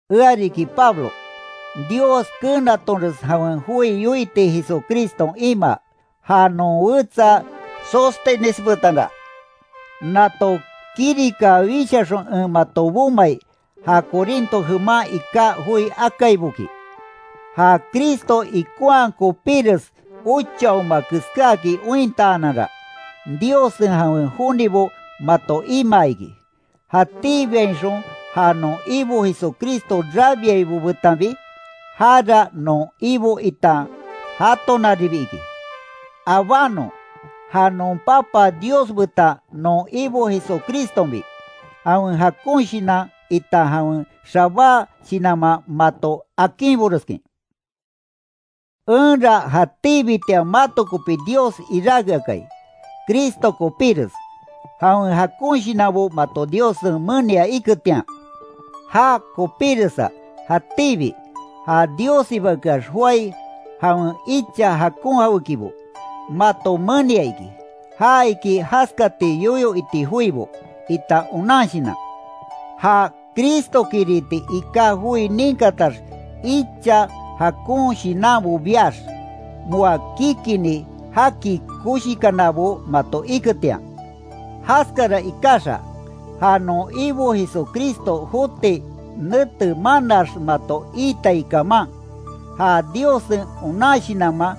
Ea riki Pablo, Dios keenatonres jawen joi yoiti Jesucriston imaa, ja non wetsa Sóstenes betanra, nato kirika wishaxon en mato bomai, ja Corinto jeman iká joi akaiboki. Ja Cristo ikonhaa kopíres ochaoma keskáakin ointaananra, Diossen jawen jonibo mato imaa iki, jatíbiainxon ja non Ibo Jesucristo rabiaibo betanbi. Jara non Ibo itan jatonaribi iki. Abánon ja non Papa Dios betan non Ibo Jesucristonbi, jawen jakon shinan itan jawen xabá shinanman mato akinboreskin. Enra jatíbitian mato kopi Dios iráke akai, Cristo kopíres, jawen jakon shinanbo mato Diossen menia iketian. Já kopiresa jatíbi, ja Diossibakeax joái jawen icha jakon jawékibo, mato menia iki. Ja iki, jaskati yoyo iti joibo, itan onan shinan. Ja Cristokiriti iká joi ninkatax icha jakon shinanbo biax, moa kikini jaki koshikanabo mato iketian, jaskara ikaxa, ja non Ibo Jesucristo joti nete manaax mato iitai kaman, ja Diossen onan shinanman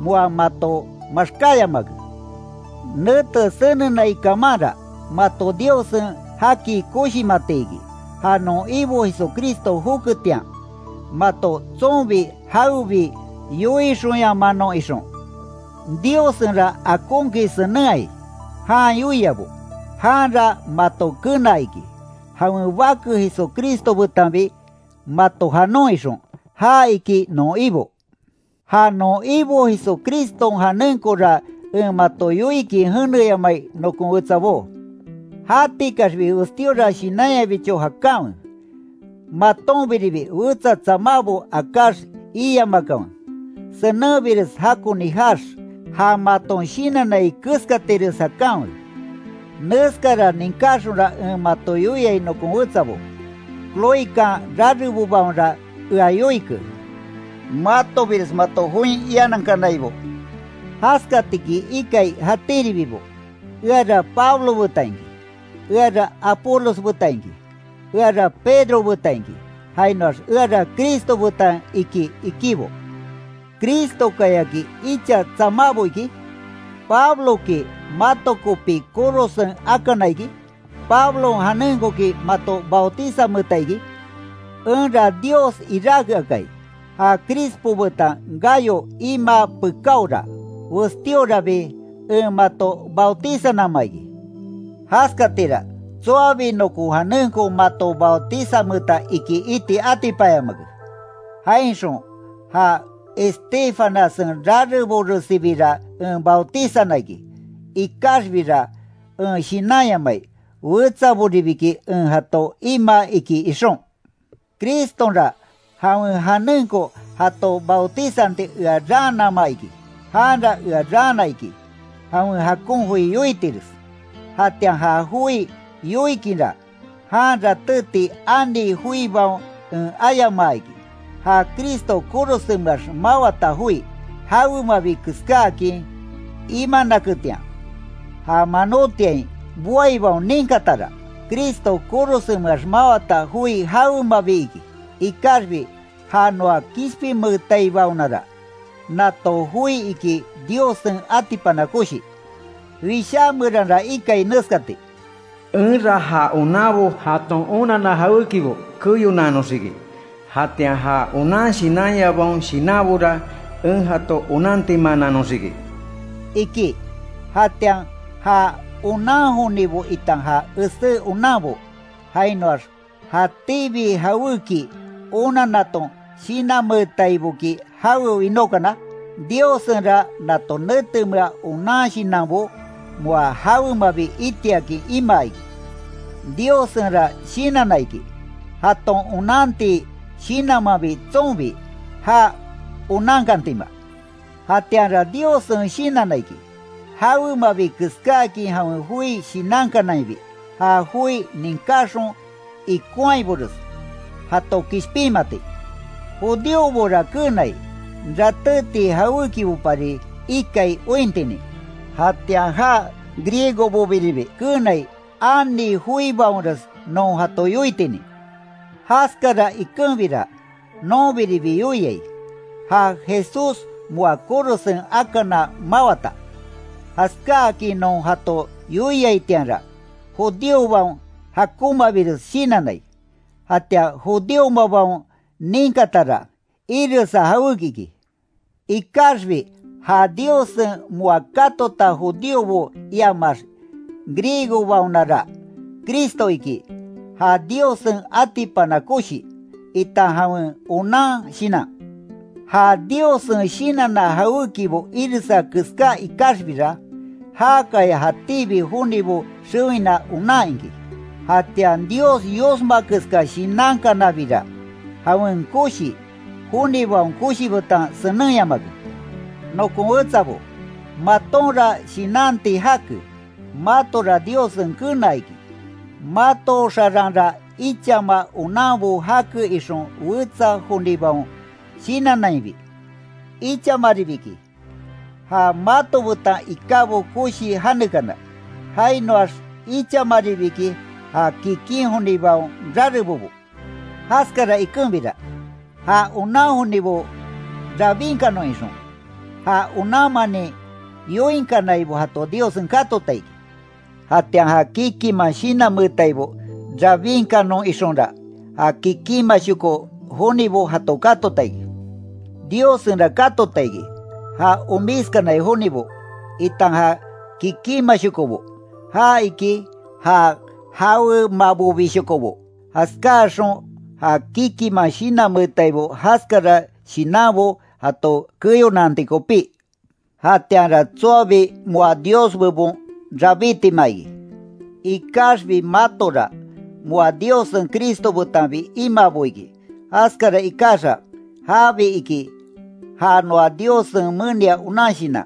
moa mato maxkáyamake. Nete senenai kamanra, mato Diossen jaki koshimati iki, ja non Ibo Jesucristo joketian, mato tsonbi jawebi yoixonyamanon ixon. Diossenra akonkin senenhai, jan yoiabo. Janra mato kenaa iki, jawen Bake Jesucristo betanbi mato janon ixon, ja iki non Ibo. Ja non Ibo Jesucriston janenkora en mato yoikin jeneyamai nokon wetsabó; jatikaxbi westíora shinanyabicho jakanwe, matonbiribi wetsa tsamábo akáx iamakanwe, senenbires jakoni jaax, ja maton shinannai keskatires jakanwe. Neskara ninkáxonra en mato yoiai nokon wetsabo. Cloekan rarebobaonra ea yoike, matobires mato join ianankanaibo. Jaskatiki ikai jatíribibo: Eara Pablo betan iki; eara Apolos betan iki; eara Pedro betan iki; jainoax eara Cristo betan iki, ikibo. ¿Cristokayaki icha tsamábo iki? ¿Pabloki mato kopi korosen akana iki? ¿Pablon janenkoki mato bautizanmeeta iki? Enra Dios iráke akai. Ja Crispo betan Gayo imaa pekáora, westíorabi en mato bautizannama iki, jaskatira, tsoabi nokon janenko mato bautizanmeeta iki iti atipanyamake. Jainxon ja Estéfanassen rareboresibira en bautizana iki. Ikaxbira en shinanyamai, wetsaboribiki en jato imaa iki ixon. Cristonra jawen janenko jato bautizanti ea raanama iki. Janra ea raana iki, jawen jakon joi yoitires. Jatian ja joi yoikinra, jan ratéti ani joibaon en ayamaa iki, ja Cristo korosenmeax mawata joi, jawemabi keskáakin imanaketian. Ja manótiain boaibaon ninkatara, Cristo korosenmeax mawata joi jawemabi iki. Ikaxbi ja noa kishpinmeetaibaonara, nato joi iki Diossen atipana koshi. Wishá meranra ikai neskati: “Enra ja onanbo, jaton onanna jawékibo keyonaanoxiki. Jatian ja onan shinanyabaon shinanbora, en jato onantimaananoxiki”, iki. ¿Jatian ja onan jonibo itan ja esé onanbo, jainoax, jatíbi jawéki onannaton shinanmeetaiboki jawe winókana? Diossenra nato netemea onan shinanbo, moa jawemabi itiakin imaa iki. Diossenra shinanna iki, jaton onanti shinanmanbi tsonbi, já onankantima. Jatianra Diossen shinanna iki, jawemabi keskáakin jawen joi shinankanainbi, ja joi ninkaxon ikonhaibores, jato kishpinmati. Judíobora keenai, ratéti jawékibopari ikai ointinin, jatian ja griegobobiribi keenai ani joibaonres non jato yoitinin. Jaskara ikenbira, nonbiribi yoiai, ja Jesús moa korosen akana mawata. Jaskáakin non jato yoiaitianra, judíobaon jakonmabires shinannai. Jatian judíomabaon ninkatara, iresa jawéki iki. Ikaxbi ja Diossen moa katota judíobo iamax griegobaonara, Cristo iki, ja Diossen atipana koshi, itan jawen onan shinan. Ja Diossen shinanna jawékibo iresa keská ikaxbira, jákaya jatíbi jonibo xewina onan iki. Jatian Dios yosma keska shinankanabira, jawen koshi, jonibaon koshi betan senenyamake. Nokon wetsabo, matonra shinanti jake, matora Diossen kenaa iki, mato xaranra ichama onanbo jake ixon wetsa jonibaon shinannainbi, ichamaribi iki, ja mato betan ikábo koshi janekana, jainoax ichamaribi iki, ja kikin jonibaon rarebobo. Jaskara ikenbira, ja onan jonibo rabinkanon ixon, ja onanmanin yoinkanaibo jato Diossen katota iki. Jatian ja kikinman shinanmeetaibo rabinkanon ixonra, ja kikinmashoko jonibo jato katota iki. Diossenra katota iki, ja omiskanai jonibo, itan ja kikinmashokobo, ja iki, ja jawemabobishokobo. Jaskáaxon ja kikinman shinanmeetaibo jaskara shinanbo jato keyonanti kopí. Jatianra tsoabi moa Dios bebon rabítima iki. Ikaxbi matora, moa Diossen Cristo betanbi imaabo iki. Jaskara ikaxa, jabi iki, ja noa Diossen menia onan shinan.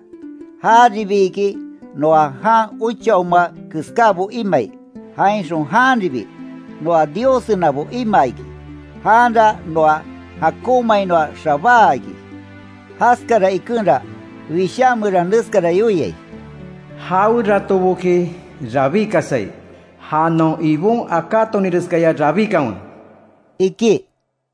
Jaribi iki, noa jan ochaoma keskábo imai, jainxon janribi, noa Diossenabo imaa iki, janra noa jakonmainoa xabáa iki. Jaskara ikenra, Wishá meran neskara yoiai: “Jaweratoboki rabíkasai, ja non Ibon akátoninreskaya rabikanwe”, iki.